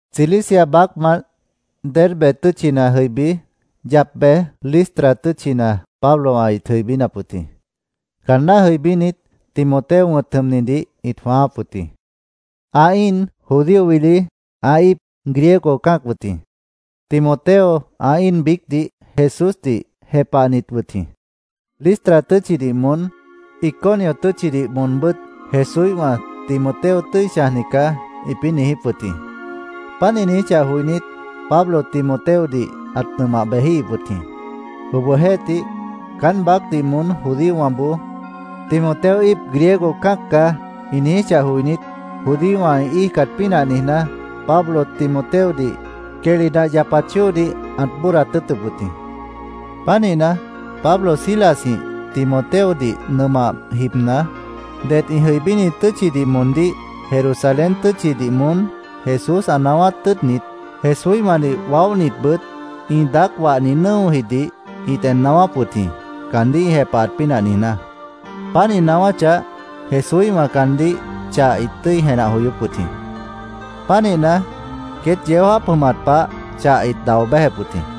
Cilicia baácmant Derbe tʉ́tchina jʉibí, yap bej, Listra tʉ́tchina Pablowã ĩt jʉibínap wʉt jĩ. Caanná jʉibínit, Timoteo wʉ̃t jʉmnidih ĩt jwãááp wʉt jĩ. Ã íin judío wili, ã íip Griego cã́ac wʉt jĩ. Timoteo, ã íin biícdih Jesúsdih jepahnit wʉt jĩ. Listra tʉ́tchidih moón, Iconio tʉ́tchidih moonbʉ́t Jesúíhwã “Timoteo tʉ́i chãjni caá”, ĩpĩ́ niijíp wʉt jĩ. Páant ĩ niijíchah joinít, Pablo Timoteodih ãt nʉmah bejíhip wʉt jĩ. Obohjeéhtih, caán baácdih moón judíowãboó “Timoteo íip Griego cã́ac caá”, ĩ niijíchah joinít, judíowã ĩ íijcat pínah niijná, Pablo Timoteodih quehli nah yapat chóodih ãt bóodat tʉ́ʉtʉp wʉt jĩ. Pánihna, Pablo Silasjĩh Timoteodih nʉmah jibna, ded ĩ jʉibíni tʉ́tchidih moondíh Jerusalén tʉ́tchidih moón Jesús ã naáwát tʉ́ʉtnit, Jesúíhwãdih waóhnitbʉt ĩ daác wahni nʉ́ojidih ĩt en naáwáp wʉt jĩ, caandíh ĩ jepahat pínah niijná. Páant ĩ naáwáchah, Jesúíhwã caandíh chah ĩt tʉ́i jenah joyóp wʉt jĩ. Pánihna, queét yeó jáap jʉmat pah chah ĩt dao béjep wʉt jĩ.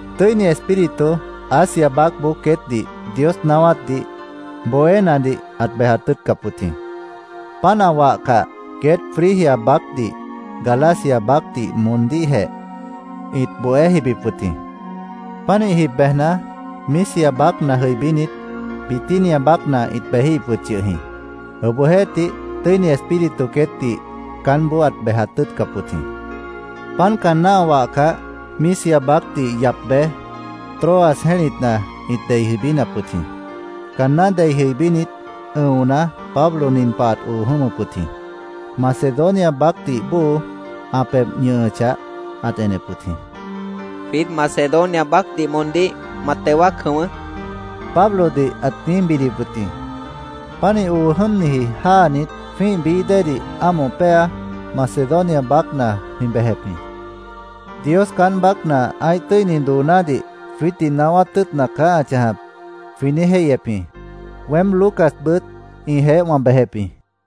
Tʉ́ini Espíritu Asia baácboó queétdih Dios naáwátdih bohénadih ãt bejat tʉ́ʉtcap wʉt jĩ. Páant ã wahcah, queét Frigia baácdih, Galacia baácdih moondíhjeh ĩt bohé jibip wʉt jĩ. Pánih jib bejna, Misia baácna jʉibínit, Bitinia baácna ĩt bejíhip wʉt yʉh jĩ. Obohjeéhtih, Tʉ́ini Espíritu queétdih caánboó ãt bejat tʉ́ʉtcap wʉt jĩ. Páant caanná ã wahcah, Misia baácdih yap bej, Troas jẽ́litna ĩt dei jʉibínap wʉt jĩ. Caanná dei jʉibínit, ʉ̃ona, Pablo nin pah ãt oo jʉ́mʉp wʉt jĩ: Macedonia baácdih bóo ã pebh ñʉhʉchah, ãt enep wʉt jĩ. “Jwiít Macedonia baácdih moondíh ma teo wáac jʉ̃ʉ́wʉ́”, Pablodih ãt niíj bidip wʉt jĩ. Pánih oo jʉ́mniji jáanit, jwĩ́ih bií déedih ámoh péa, Macedonia baácna jwĩ bejep jĩ. “Dios caán baácna ã́ih tʉ́ini doonádih jwiítdih naáwát tʉ́ʉtna caá ã chãjap”, jwĩ niíj jéihyep jĩ. Weém Lucasbʉt ĩjeéh wã bejep jĩ.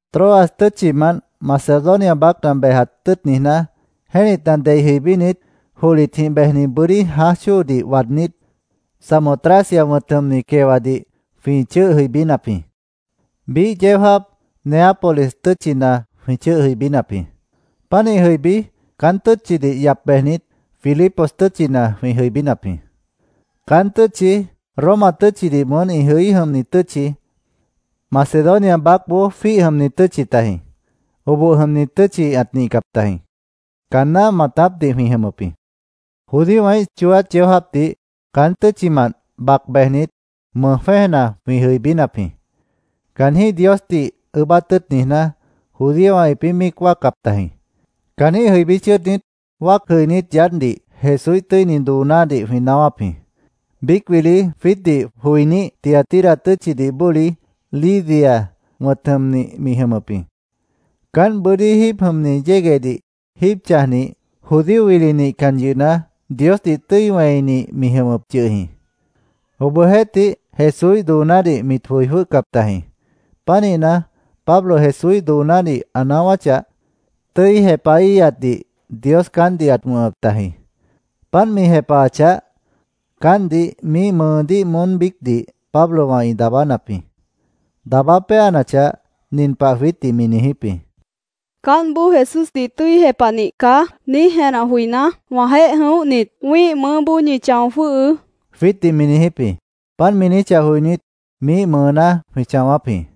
Troas tʉ́tchimant Macedonia baácna bejat tʉ́ʉt niijná, jẽ́litna dei jʉibínit, johlitjĩh bejni bʉ́dí jãáj chóodih waadnít, Samotracia wʉ̃t jʉmni quewadih jwĩ chʉ́ʉh jʉibínap jĩ. Biíh yeó jáap Neápolis tʉ́tchina jwĩ chʉ́ʉh jʉibínap jĩ. Pánih jʉibí, caán tʉ́tchidih yap bejnit, Filipos tʉ́tchina jwĩ jʉibínap jĩ. Caán tʉ́tchi Roma tʉ́tchidih moón ĩ jʉí jʉmni tʉ́tchi, Macedonia baácboó jwíih jʉmni tʉ́tchi tajĩ. Oboh jʉmni tʉ́tchi ãt nihcap tajĩ. Caanná maatápdih jwĩ jʉmʉp jĩ. Judíowãíh chooát yeó jáapdih caán tʉ́tchimant bac bejnit, mʉj jwẽ́ejna jwĩ jʉibínap jĩ. Caanjĩ́h Diosdih ʉʉ́bát tʉ́ʉt niijná, judíowã ĩpĩ́ míic wáacap tajĩ. Caanjĩ́h jʉibí chʉ́ʉdnit, wáac jʉinít yaádhdih Jesúíh tʉ́ini doonádih jwĩ naáwáp jĩ. Biíc wili jwiítdih joiníh, Tiatira tʉ́tchidih bóli Lidia wʉ̃t jʉmnih mi jʉmʉp jĩ. Caánt bʉ́dí jíib jʉmni yéguehdih jíib chãjnih, judío wili nihcan yʉhna, Diosdih tʉ́i wẽinih mi jʉmʉp yʉh jĩ. Obohjeéhtih Jesúíh doonádih mit joi jwʉ́hcap tajĩ. Pánihna, Pablo Jesúíh doonádih ã naáwáchah, tʉ́i jepahíhatdih Dios caántdih ãt wʉ̃hʉp tajĩ. Páant mi jepahachah, caántdih miíh mʉʉdíh moón biícdih Pablowã ĩ daabánap jĩ. Daabá péanachah, nin pah jwiítdih mi niijíp jĩ: —‘Caántboó Jesúsdih tʉ́i jepahnih caá’, niíj jenah joiná, wãjeéh jʉ̃óhnit, wĩ́ih mʉʉ́boó ñi chão jwʉ́hʉʉ́, jwiítdih mi niijíp jĩ. Páant mi niijíchah joinít, miíh mʉʉná jwĩ chãwáp jĩ.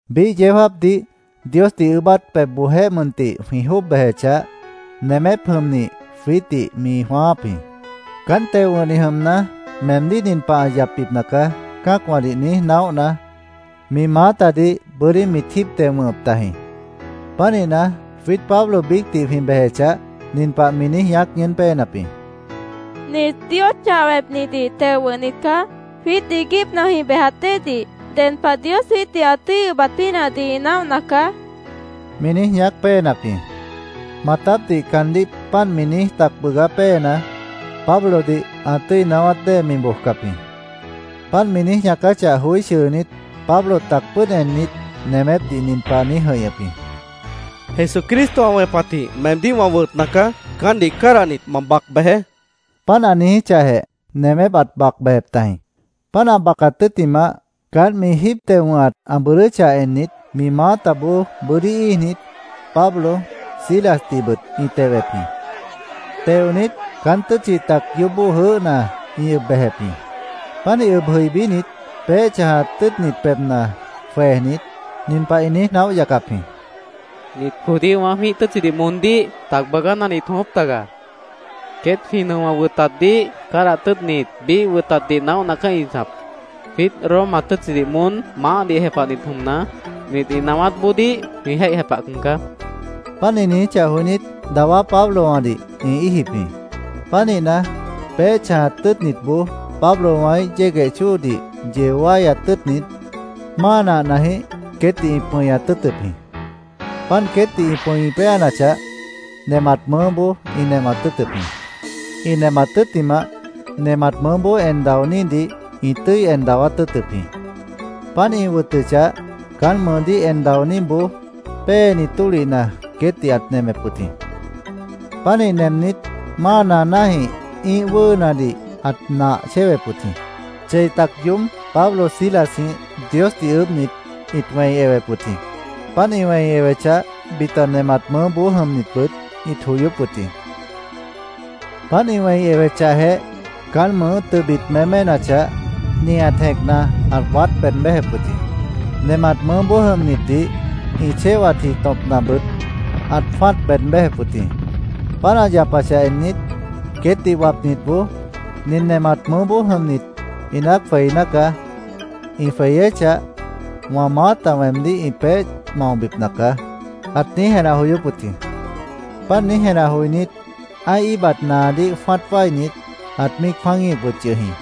Biíh yeó jáapdih Diosdih ʉʉ́bát pebhboojéh mʉntih jwĩ jwʉ́ʉb bejechah, nemép jʉmnih jwiítdih mi jwãááp jĩ. Caánt teo wʉ̃hnih jʉmna, “Meemdíh nin pah ã yapbipna caá”, cã́acwãdih niíj naóhna, mi maátadih bʉ́dí mit jíib teo wʉ̃hʉp tajĩ. Pánihna, jwiít Pablo biícdih jwĩ bejechah, nin pah mi niíj ñaác ñʉʉ́n péenap jĩ: —Nit Dios chah wẽpnidih teo wʉ̃hnit caá. Jwiít iiguípna jwĩ bejat déedih ded pah Dios jwiítdih ã tʉ́i ʉbat pínahdih ĩ naóhna caá, mi niíj ñaác péenap jĩ. Maatápdih caandíh páant mi niíj tac bʉʉgá péena, Pablodih ã tʉ́i naáwát dée mi bojcap jĩ. Páant mi niíj ñaacáchah joí chʉʉnít, Pablo tac pʉ́ʉd ennit, nemépdih nin pah ã niíj jʉ̃ihñʉp jĩ: —Jesucristo ã wẽpatjĩh meemdíh wã wʉtna caá. Caántdih cádahnit, ma bac bejeé, ã niijíp jĩ. Páant ã niijíchahjeh, nemép ãt bac bejep tajĩ. Páant ã bacat tʉ́ttimah, caánt mi jíib teo wʉ̃hat ã bʉʉdʉ́chah ennit, mi maátaboó bʉ́dí íijnit, Pablo, Silasdihbʉt ĩ tewep jĩ. Teonit, caán tʉ́tchi tac yoóbó jʉʉ́hna ĩ ʉb bejep jĩ. Pánih ʉb jʉibínit, peéh chãjat tʉ́ʉtnit pebhna jwejnit, nin pah ĩ niíj naóh yacap jĩ: —Nit judíowã jwĩ́ih tʉ́tchidih moondíh tac bʉʉgánadih ĩt jʉ̃ʉ́wʉ́p taga. Queét jwĩ nʉowã ĩ wʉtatdih cádahat tʉ́ʉtnit, biíh wʉtatdih naóhna caá ĩ chãjap. Jwiít Roma tʉ́tchidih moón maáhdih jepahnit jʉmna, nit ĩ naáwátboodíh jwĩ jéih jepahcan caá, ĩ niijíp jĩ. Páant ĩ niijíchah joinít, dawá Pablowãdih ĩ íijip jĩ. Pánihna, peéh chãjat tʉ́ʉtnitboó Pablowãíh yégueh chóodih yeo wáyat tʉ́ʉtnit, máa nahnajĩh queétdih ĩ pʉñat tʉ́ʉtʉp jĩ. Páant queétdih ĩ pʉ̃i péanachah, nemat mʉʉ́boó ĩ nemat tʉ́ʉtʉp jĩ. Ĩ nemat tʉ́ttimah, nemat mʉʉ́boó en daonídih ĩ tʉ́i en dawát tʉ́ʉtʉp jĩ. Páant ĩ wʉtʉchah, caán mʉʉdíh en daoníboó péeni tólihna queétdih ãt nemep wʉt jĩ. Pánih nemnit, máa naanájĩh ĩ́ih wʉ́ʉnadih ãt nah chéwep wʉt jĩ. Chei tac yoób Pablo Silasjĩh Diosdih ʉʉ́bhnit, ĩt wẽi ewep wʉt jĩ. Páant ĩ wẽi ewechah, bita nemat mʉʉ́boó jʉmnitbʉt ĩt joyóp wʉt jĩ. Páant ĩ wẽi ewechahjeh, caán mʉʉ́ tʉbit méménachah, nihat jẽcna ãt waát beed béjep wʉt jĩ. Nemat mʉʉ́boó jʉmnitdih ĩ chéwatji tõpnabʉt ãt jwã́at beed béjep wʉt jĩ. Páant ã yapachah ennit, queétdih wapniboó “Nin nemat mʉʉ́boó jʉmnit inát jweiná caá. Ĩ jweyéchah, wã maáta weemdíh ĩ peéh maobipna caá”, ãt niíj jenah joyóp wʉt jĩ. Páant niíj jenah joinít, ã́ih íibat naadíh jwã́at wáinit, ãt míic jwã́aguíhip wʉt yʉh jĩ.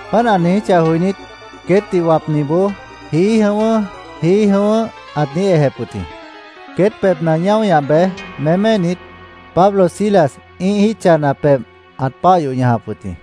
Páant ã niijíchah joinít, queétdih wapniboó “Jií jʉ̃ʉ́wʉ́, jií jʉ̃ʉ́wʉ́”, ãt niíj ejep wʉt jĩ. Queét pebhna ñáo ñah bej, méménit, Pablo Silas ĩ́ih jítcha pebh ãt páah yoh ñajap wʉt jĩ.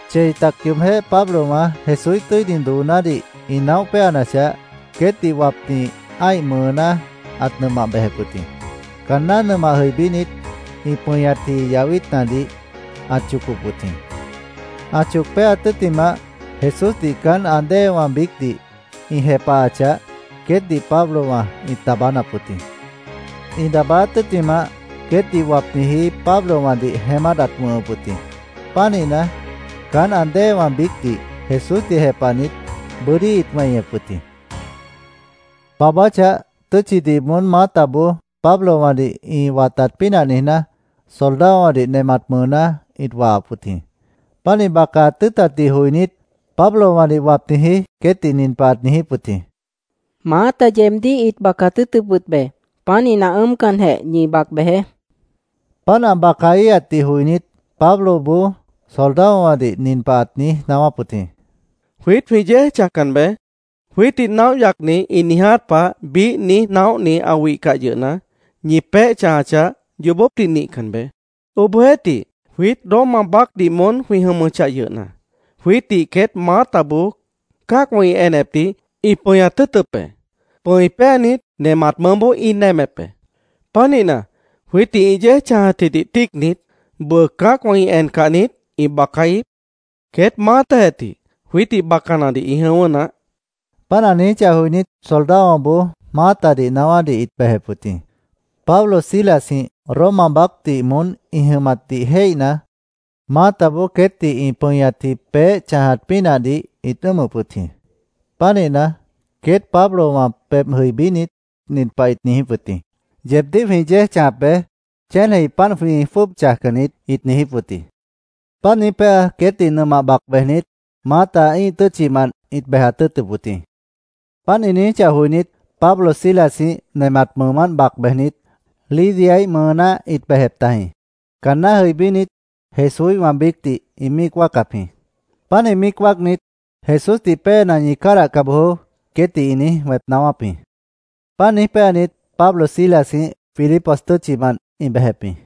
Chei tac yoobjéh Pablowã Jesúíh tʉ́ini doonádih ĩ naóh péanachah, queétdih wapni ã́ih mʉʉná ãt nʉmah bejep wʉt jĩ. Caanná nʉmah jʉibínit, ĩ pʉñatji yahwítnadih ãt chocop wʉt jĩ. Ã choc péaat tʉ́ttimah, Jesúsdih caán ã déewã biícdih ĩ jepahachah, queétdih Pablowã ĩt daabánap wʉt jĩ. Ĩ daabáát tʉ́ttimah, queétdih wapniji Pablowãdih jeémát ãt wʉ̃hʉp wʉt jĩ. Pánihna, caán ã déewã biícdih Jesúsdih jepahnit, bʉ́dí ĩt weñep wʉt jĩ. Baabáchah, tʉ́tchidih moón maátaboó Pablowãdih ĩ watat pínah niijná, soldadowãdih nemat mʉʉná ĩt wahap wʉt jĩ. Páant ĩ bacaat tʉ́ʉtatdih joinít, Pablowãdih wapniji queétdih nin pah ãt niijíp wʉt jĩ: —Maáta yeebdíh ĩt bacaat tʉ́ʉtʉp wʉt be. Pánihna, ʉ́ʉmcanjeh, ñi bac bejeé, ãt niijíp wʉt jĩ. Páant ã bacaíhatdih joinít, Pabloboó soldadowãdih nin pah ãt niíj naáwáp wʉt jĩ: —Jwiít jwĩ yéej chãjcan be. Jwiítdih naóh yacnit ĩ niiját pah biíh niíj naóhni ã wihcah yʉhna, ñi peéh chãjachah, yoobópdih nihcan be. Obohjeéhtih, jwiít Roma baácdih moón jwĩ jʉmʉchah yʉhna, jwiítdih queét maátaboó cã́acwã ĩ enepdih ĩ pʉñat tʉ́ʉtʉp be. Pʉ̃i péanit, nemat mʉʉ́boó ĩ nemep be. Pánihna, jwiítdih ĩ yéej chãjatjidih tíicnit, ¿bʉʉ cã́acwã ĩ encah niít, ĩ bacaíhip? Queét maátajeh tih jwiítdih bacanadih ĩ jʉ̃ʉ́wʉ́ naáh, ãt niijíp wʉt jĩ. Páant ã niijíchah joinít, soldadowãboó maátadih naáwádih ĩt bejep wʉt jĩ. Pablo Silasjĩh Roma baácdih moón ĩ jʉmatdih jéihna, maátaboó queétdih ĩ pʉñatji peéh chãjat pínahdih ĩt ʉ́ʉmʉp wʉt jĩ. Pánihna, queét Pablowã pebh jʉibínit, nin pah ĩt niijíp wʉt jĩ: “Yeebdíh jwĩ yéej chãjap be. Chéneji páant jwĩ jwʉ́ʉb chãjcan niít”, ĩt niijíp wʉt jĩ. Páant niíj péa, queétdih nʉmah bac bejnit, maáta ĩ́ih tʉ́tchimant ĩt bejat tʉ́ʉtʉp wʉt jĩ. Páant ĩ niijíchah joinít, Pablo Silasjĩh nemat mʉʉmánt bac bejnit, Lidiaíh mʉʉná ĩt bejep tajĩ. Caanná jʉibínit, Jesúíhwã biícdih ĩ míic wáacap jĩ. Pánih míic wáacnit, “Jesúsdih péena, ñi cádahca bojoó”, queétdih ĩ niíj wẽp naáwáp jĩ. Páant niíj péanit, Pablo Silasjĩh Filipos tʉ́tchimant ĩ bejep jĩ.